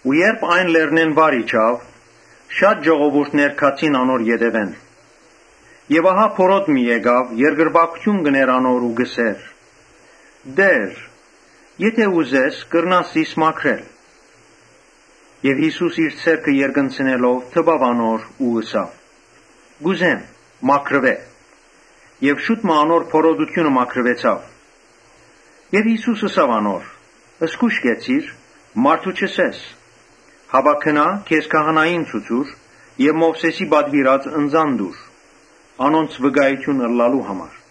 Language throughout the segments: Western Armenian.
Երբ լեռնէն վար իջաւ, շատեր գացին անոր ետեւէն։ Ահա բորոտ մը եկաւ, երկրպագութիւն կ’ընէր անոր ու կ’ըսէր. «Տէ՛ր, եթէ ուզես, կրնաս զիս մաքրել»։ Յիսուս իր ձեռքը երկնցնելով դպաւ անոր ու ըսաւ. «Կ’ուզե՛մ, մաքրուէ»։ Շուտ մը անոր բորոտութիւնը մաքրուեցաւ։ Յիսուս ըսաւ անոր. «Զգոյշ կեցիր, մարդո՛ւ չըսես, հապա գնա, քեզ քահանային ցուցուր եւ Մովսէսին պատուիրած ընծան տուր, անոնց վկայութիւն ըլլալու համար»։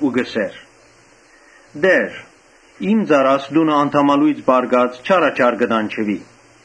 Ու կ’ըսէր. «Տէ՛ր, ծառաս տունը անդամալոյծ պառկած չարաչար կը տանջուի»։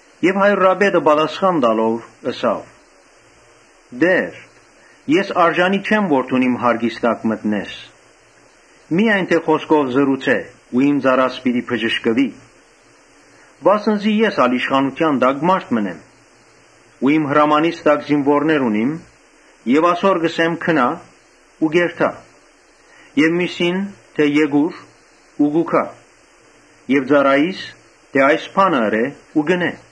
Հարիւրապետը պատասխան տալով՝ ըսաւ. «Տէ՛ր, ես արժանի չեմ որ դուն իմ յարկիս տակ մտնես. միայն խօսքով հրամայէ ու իմ ծառաս պիտի բժշկուի։ Վասն զի ես ալ իշխանութեան տակ մարդ եմ ու իմ հրամանիս տակ զինուորներ ունիմ։ Ասոր կ’ըսեմ՝ ‘Գնա՛’, ու կ’երթայ. եւ միւսին՝ թէ ‘Եկո՛ւր’, ու կու գայ եւ ծառայիս՝ թէ ‘Այս բանը ըրէ’, ու կ’ընէ»։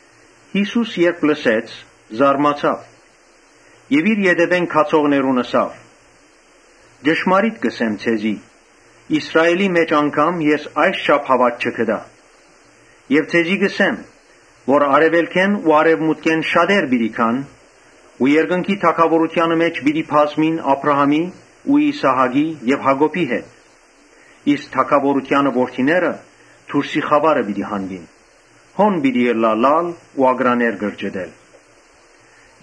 Յիսուս երբ լսեց, զարմացաւ եւ իր ետեւէն գացողներուն ըսաւ. «Ճշմարիտ կ’ըսեմ ձեզի, Իսրայէլի մէջ անգամ ես այսչափ հաւատք չգտայ։ Ձեզի կ’ըսեմ թէ արեւելքէն ու արեւմուտքէն շատեր պիտի գան ու երկնքի թագաւորութեանը մէջ պիտի բազմին Աբրահամին ու Իսահակին եւ Յակոբին հետ. Իսկ թագաւորութեանը որդիները դուրսի խաւարը պիտի հանուին. հոն պիտի ըլլայ լալ ու ակռաներ կրճտել»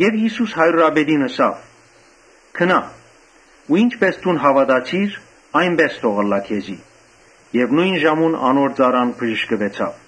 Յիսուս հարիւրապետին ըսաւ. «Գնա ու ինչպէս դուն հաւատացիր, այնպէս թող ըլլայ քեզի»։ Նոյն ժամուն անոր ծառան բժշկուեցաւ։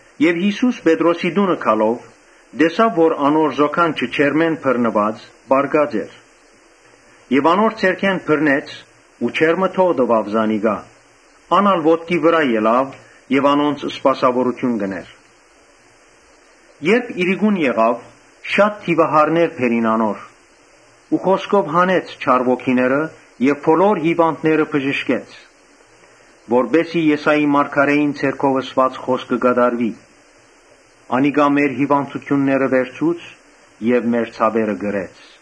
Յիսուս Պետրոսի տունը գալով, տեսաւ որ անոր զոքանչը ջերմէն բռնուած՝ պառկած էր։ Անոր ձեռքէն բռնեց ու ջերմը թող տուաւ զանիկա։ Ան ալ ոտքի ելաւ եւ Ոմանք, անորանոնց սպասաւորութիւն կ’ընէր։ Երբ իրիկուն եղաւ, շատ դիւահարներ բերին անոր։ Խօսքով հանեց չար ոգիները եւ բոլոր հիւանդները բժշկեց. Որպէս զի Եսայի մարգարէին միջոցով ըսուած խօսքը կատարուի. «Անիկա մեր հիւանդութիւնները վերցուց եւ մեր ցաւերը կրեց»։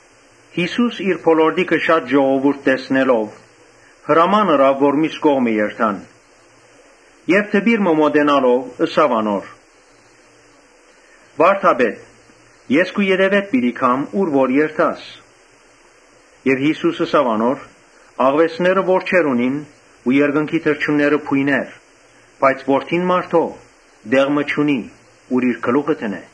Յիսուս իր բոլորտիքը շատ ժողովուրդ տեսնելով, հրաման ըրաւ որ միւս կողմը երթան։ Դպիր մը մօտենալով՝ ըսաւ անոր. «Վա՛րդապետ, ես քու ետեւէդ պիտի գամ ուր որ երթաս»։ Յիսուս ըսաւ անոր. «Աղուէսները որջեր ունին ու երկնքի թռչունները բոյներ, բայց Որդին մարդոյ տեղ մը չունի, ուր իր գլուխը դնէ»։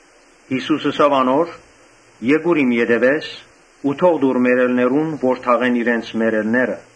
Յիսուս ըսաւ անոր. «Եկուր իմ ետեւէս ու թող տուր մեռելներուն, որ թաղեն իրենց մեռելները»։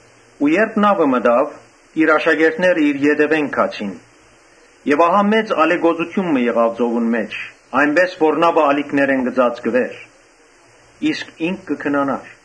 Երբ նաւը մտաւ, իր աշակերտները իր ետեւէն գացին։ Ահա մեծ ալեկոծութիւն մը եղաւ ծովուն մէջ, այնպէս որ նաւը ալիքներէն կը ծածկուէր. իսկ ինք կը քնանար։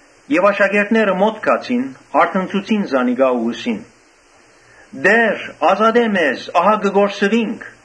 Աշակերտները իր մօտ գացին, արթնցուցին զանիկա ու ըսին. «Տէ՛ր, ազատէ մեզ, ահա կը կորսուինք»։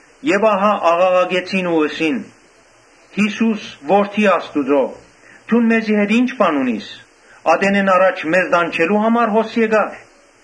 Ահա աղաղակեցին ու ըսին. «Յիսո՛ւս, Որդի Աստուծոյ, դուն մեզի հետ ի՞նչ բան ունիս, ատենէն առաջ մեզ տանջելո՞ւ համար հոս եկար»։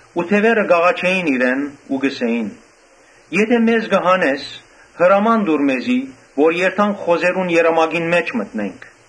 Դեւերը կ’աղաչէին իրեն ու կ’ըսէին. ‘Եթէ մեզ հանես, հրաման տուր մեզի որ երթանք խոզերուն երամակին մէջ մտնենք’։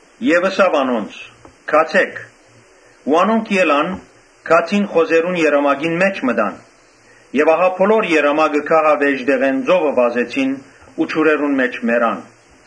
Ըսաւ անոնց. «Գացէ՛ք»։ Անոնք ելան գացին խոզերուն երամակին մէջ մտան եւ ահա բոլոր երամակը գահավէժ տեղէն ծովը վազեցին ու ջուրերու մէջ մեռան։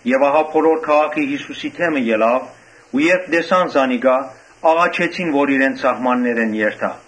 Ուստի բոլոր քաղաքը Յիսուսի դէմը ելաւ ու երբ տեսան զանիկա, աղաչեցին որ իրենց սահմաններէն երթայ։